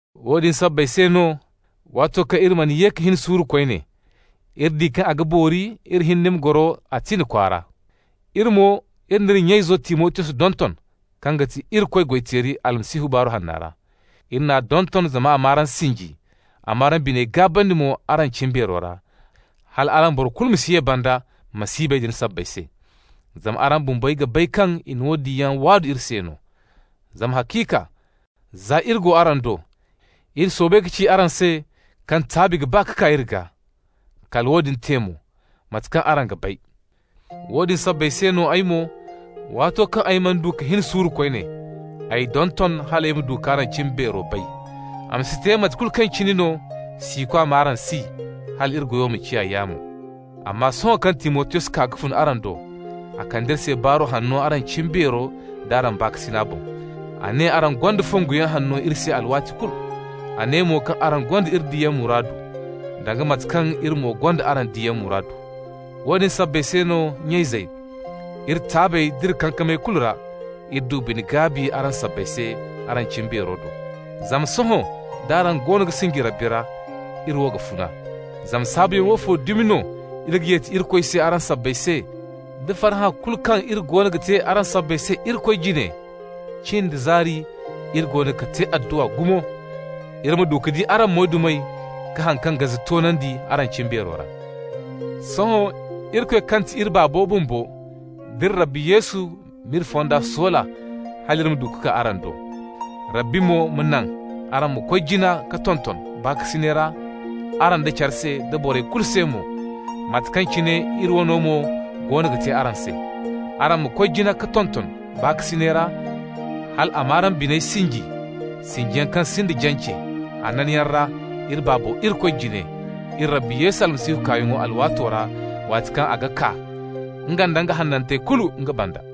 Woodin sabbay se no, waato kaŋ iri mana ye ka hin suuru koyne, iri di kaŋ a ga boori iri hinne ma goro Atina kwaara. Iri mo n'iri nya-izo Timotiyos donton, kaŋ ga ti Irikoy goy-teeri Almasihu Baaru Hanna ra. Iri n'a donton zama a m'araŋ sinji, a m'araŋ biney gaabandi mo araŋ cimbeero ra, hala boro kulu ma si ye banda masiibey din sabbay se. Zama araŋ bumbey ga bay kaŋ i na woodin yaŋ waadu iri se. Zama haciika za iri go araŋ do, iri soobay ka ci araŋ se kaŋ taabi ga ba ka kaa iri gaa. Kala woodin te mo, mate kaŋ araŋ ga bay. Woodin sabbay se no ay mo, waato kaŋ ay mana du ka hin suuru koyne, ay donton hal ay ma du k'araŋ cimbeero bay, a ma si te mate kulu kaŋ cine no, siikwa m'araŋ si, hal iri goyo ma ciya yaamo. Amma sohõ kaŋ Timotiyos kaa ka fun araŋ do, a kande iri se baaru hanno araŋ cimbeero d'araŋ baakasina boŋ. A ne araŋ gonda fonguyaŋ hanno iri se alwaati kulu. A ne mo kaŋ araŋ gonda iri diyaŋ muraadu, danga mate kaŋ iri mo gonda araŋ diyaŋ muraadu. Woodin sabbay se, nya-izey, iri taabey d'iri kankamey kulu ra, iri du bine-gaabi araŋ sabbay se araŋ cimbeero do. Zama sohõ d'araŋ goono ga sinji Rabbi ra, iri wo ga funa. Zama saabuyaŋ woofo dumi no iri ga yeti Irikoy se araŋ sabbay se, da farhã kulu kaŋ iri goono ga te se araŋ sabbay se Irikoy jine? Cin da zaari iri goono ga te adduwa gumo iri ma du ka di araŋ moydumey ka haŋ kaŋ gaze toonandi araŋ cimbeero ra. Sohõ Irikoy kaŋ ti iri Baabo bumbo, d'iri Rabbi Yesu m'iri fonda soola hal iri ma du ka kaa araŋ do. Rabbi mo ma naŋ araŋ ma koy jina ka tonton baakasinay ra araŋ da cara se da borey kulu se mo, mate kaŋ cine iri wano mo goono ga te araŋ se. Araŋ ma koy jina ka tonton baakasinay ra hal a ma araŋ biney sinji, sinjiyaŋ kaŋ sinda jance, hananyaŋ ra iri Baaba Irikoy jine, iri Rabbi Yesu kaayaŋo alwaato ra, waati kaŋ a ga kaa, nga nda nga hanantey kulu nga banda.